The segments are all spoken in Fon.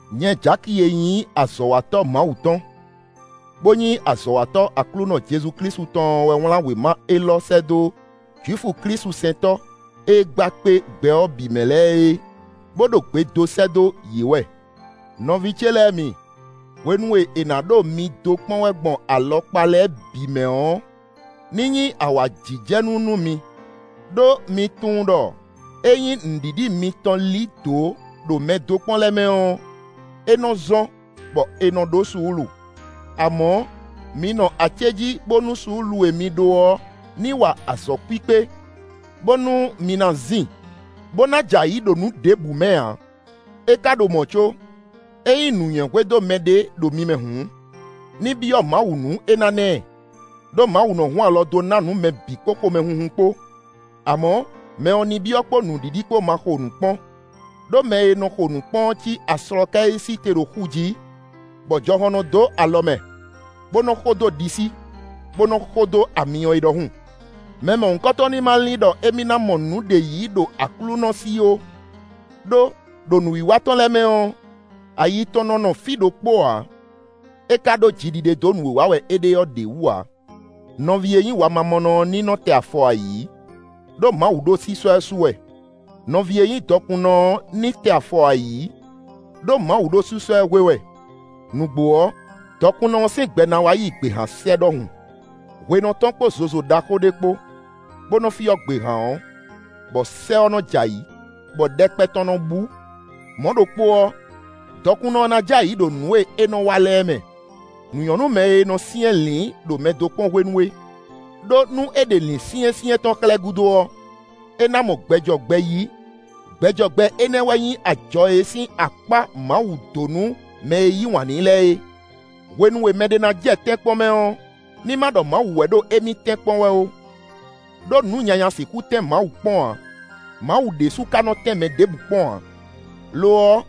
Nyɛ Jaki e nyí azɔ̌watɔ́ Mawu tɔn, bó nyí azɔ̌watɔ́ Aklúnɔ Jezu Klísu tɔn ɔ́ wɛ wlán wěma élɔ́ sɛ́ dó Jwifu klísusɛntɔ́ e gba kpé gbɛ ɔ́ bǐ mɛ lɛ́ɛ é, bó ɖo gbe dó sɛ́ dó yě wɛ. Nɔví ce lɛ́ɛ mi, hwenu e è nǎ ɖo mi dó kpɔ́n wɛ gbɔn alɔkpa lɛ́ɛ bǐ mɛ ɔ́, ní nyí awǎjijɛnú nú mi; ɖó mi tunwun ɖɔ ényí nǔɖiɖi mitɔn lí dǒ ɖo mɛ dó kpɔ́n lɛ́ɛ mɛ ɔ́, é nɔ zɔ́n bɔ è nɔ ɖó suúlu. Amɔ̌, mi nɔ acéjí bónú suúlu e mi ɖó ɔ́ ní wa azɔ̌ kpíkpé, bónú mi ná zin, bó ná jɛ ayǐ ɖo nǔ ɖěbǔ mɛ ǎ. É ka ɖo mɔ̌ có, ényí nǔnywɛ́ hwedó mɛɖé ɖo mi mɛ hǔn, ní byɔ́ Mawu nú é ná ná ɛ; ɖó Mawu nɔ hun alɔ dó ná nǔ mɛ bǐ kpó xomɛhunhun kpó. Amɔ̌, mɛ ɔ́ ní byɔ́ kpó nǔɖiɖi kpó ma xo nǔ kpɔ́n; ɖó mɛ e nɔ xo nǔ kpɔ́n ɔ́ cí aslɔkɛ́ e sí te ɖo xu jí, bɔ jɔhɔn nɔ dó alɔ mɛ, bó nɔ xo dó ɖisí, bó nɔ xo dó amyɔ é ɖɔhun. Mɛ mɔ̌hunkɔtɔn ní ma lin ɖɔ émí ná mɔ nǔɖé yí ɖo Aklúnɔ sí ó; ɖó, ɖo nǔwiwa tɔn lɛ́ɛ mɛ ɔ́, ayi tɔn nɔ nɔ fí ɖokpó ǎ; é ka ɖó jiɖiɖe dó nǔ e wa wɛ é ɖe ɔ́ ɖě wú ǎ. Nɔví e nyí wamamɔnɔ ɔ́ ní tɛ afɔ ayǐ, ɖó Mawu ɖo sísɔ́ ɛ su wɛ; nɔví e nyí dɔkunnɔ ɔ́ ní tɛ afɔ ayǐ ɖó Mawu ɖo sísɔ́ ɛ hwe wɛ. Nǔgbó ɔ́, dɔkunnɔ ɔ́ sín gbɛ ná wá yi gběhan sɛ́ ɖɔhun. Hwe nɔ tɔ́n kpó zozo ɖaxó ɖé kpó, bó nɔ fyɔ́ gběhan ɔ́, bɔ sɛ́ ɔ́ nɔ jɛ ayǐ, bɔ ɖɛkpɛ tɔn nɔ bú. Mɔ̌ ɖokpó ɔ́, dɔkunnɔ ɔ́ ná jɛ ayǐ ɖo nǔ e é nɔ wa lɛ́ɛ mɛ. Nǔ nyɔ́ nú mɛ e nɔ syɛ́nlǐn ɖo mɛdókpɔ́n hwenu é; ɖó nú é ɖe lǐnsyɛ́nsyɛ́n tɔn xlɛ́ gúdo ɔ́, é ná mɔ gbɛ jɔ gbɛ yí; gbɛ jɔ gbɛ énɛ́ wɛ nyí ajɔ e sín akpá Mawu dó nú mɛ e yí wǎn n'i lɛ́ɛ é. Hwenu e mɛɖé ná jɛ tɛ́nkpɔ́n mɛ ɔ́, ní ma ɖɔ Mawu wɛ ɖo émí tɛ́nkpɔ́n wɛ ó. Đó nǔ nyanya sixú tɛ́n Mawu kpɔ́n ǎ; Mawu ɖésú ka nɔ tɛ́n mɛ ɖěbǔ kpɔ́n ǎ. Lo ɔ́,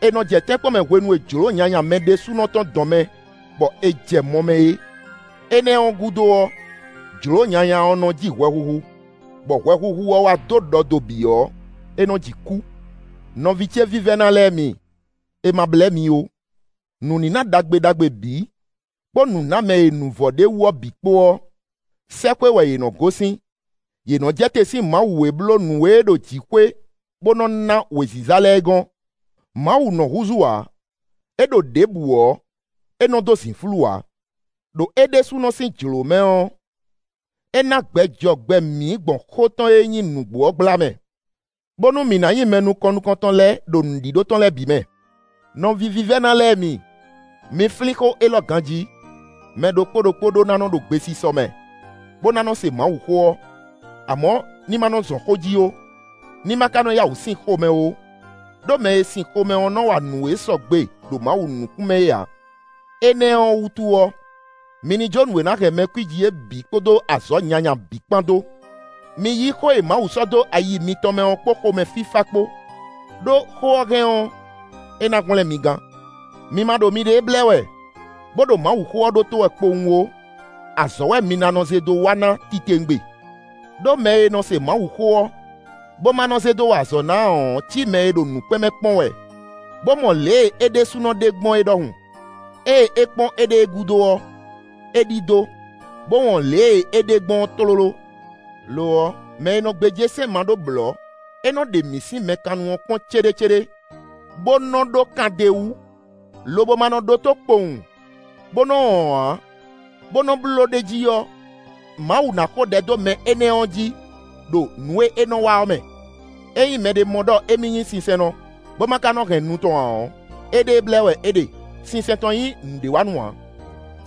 è nɔ jɛ tɛ́nkpɔ́n mɛ hwenu e jlǒ nyanya mɛ ɖésúnɔ tɔn dɔn mɛ, bɔ è jɛ mɔ mɛ é. Énɛ́ ɔ́ gúdo ɔ́, jlǒ nyanya ɔ́ nɔ ji hwɛhuhu, bɔ hwɛhuhu ɔ́ wá dó ɖɔ do bǐ ɔ́, é nɔ ji kú. Nɔví ce vívɛ́ná lɛ́ɛ mi, è ma blɛ́ mi ó. Nǔníná ɖagbe ɖagbe bǐ, kpó nǔnámɛ e nǔ vɔ ɖ'é wú ɔ́ bǐ kpó ɔ́, sɛ́xwé wɛ yě nɔ gosín; yě nɔ jɛ te sín Mawu e bló nǔ e ɖo jǐxwé bó nɔ ná wěziza lɛ́ɛ é gɔ́n; Mawu nɔ húzú ǎ; é ɖo ɖěbǔ ɔ́, é nɔ dó zǐnflú ǎ. Đo é ɖésúnɔ sín jlǒ mɛ ɔ́, é ná gbɛ jɔ gbɛ mǐ gbɔn xó tɔn e nyí nǔgbó ɔ́ gbla mɛ, bónú mǐ ná nyí mɛ nukɔn nukɔntɔn lɛ́ɛ ɖo nǔɖíɖó tɔn lɛ́ɛ bǐ mɛ. Nɔví vívɛ́ná lɛ́ɛ mi, mi flín xó élɔ́ ganjí: mɛ ɖokpó ɖokpó ɖó ná nɔ ɖo gbesisɔ mɛ, bó ná nɔ se Mawuxó ɔ́; amɔ̌ ní ma nɔ zɔn xó jí ó; ní ma ka nɔ yá wǔ sin xomɛ ó; ɖó mɛ e sin xomɛ ɔ́ nɔ wa nǔ e sɔgbe ɖo Mawu nukún mɛ é ǎ. Énɛ́ ɔ́ wútu ɔ́, mi ní jó nǔ e ná hɛn mɛ kwíji é bǐ kpódó azɔ̌ nyanya bǐ kpán dó. Mi yí xó e Mawu sɔ́ dó ayi mitɔn mɛ ɔ́ kpó xomɛ fífá kpó; ɖó xó ɔ́ hɛn ɔ́, é ná hwlɛ́n mi gán. Mi ma ɖo miɖée blɛ́ wɛ, bó ɖo Mawuxó ɔ́ ɖótó wɛ kpowun ó; azɔ̌ wɛ mi ná nɔ zé dó wa ná titewungbe. Đó mɛ e nɔ se Mawuxó ɔ́, bó ma nɔ zé dó wa azɔ̌ ná ǎ ɔ́ cí mɛ e ɖo nǔkpɛ́n mɛ kpɔ́n wɛ, bó mɔ lě e é ɖésúnɔ ɖe gbɔn é ɖɔhun. Ée é kpɔ́n éɖée gúdo ɔ́, é ɖidó, bó wɔn lě e é ɖe gbɔn ɔ́ tlóló. Lo ɔ́, mɛ e nɔ gbéjé sɛ́n ma ɖó blɔ̌ e nɔ ɖe mǐ sín mɛ kannu ɔ́ kpɔ́n céɖécéɖé, bó nɔ ɖó kan d'é wú, lobo ma nɔ ɖótó kpowun, bó nɔ wɔn ǎ, bó nɔ bló ɖ'é jí ɔ́, Mawu ná xo ɖɛ dó mɛ énɛ́ ɔ́ jí, ɖo nǔ e é nɔ wa ɔ́ mɛ. Ényí mɛɖé mɔ ɖɔ émí nyí sinsɛnnɔ, bó ma ka nɔ hɛn nu tɔn ǎ ɔ́, éɖée blɛ́ wɛ é ɖe; sinsɛn tɔn nyí nǔɖéwanú ǎ.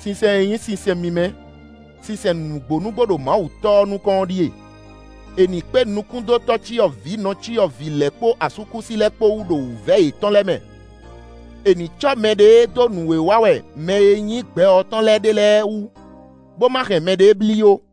Sinsɛn e nyí sinsɛn mímɛ́, sinsɛn nǔgbó nǔgbó ɖo Mawu Tɔ́ ɔ́ nukɔn ɔ́ ɖíe: è nǐ kpé nukún dó tɔ́cyɔvǐ nɔcyɔvǐ lɛ́ɛ kpó asúkúsi lɛ́ɛ kpó wú ɖo wǔvɛ́ yětɔn lɛ́ɛ mɛ; è nǐ cɔ́ mɛɖée dó nǔ e wa wɛ mɛ e nyí gbɛ ɔ́ tɔn lɛ́ɛ ɖe lɛ́ɛ wú, bó ma hɛn mɛɖée blí ó.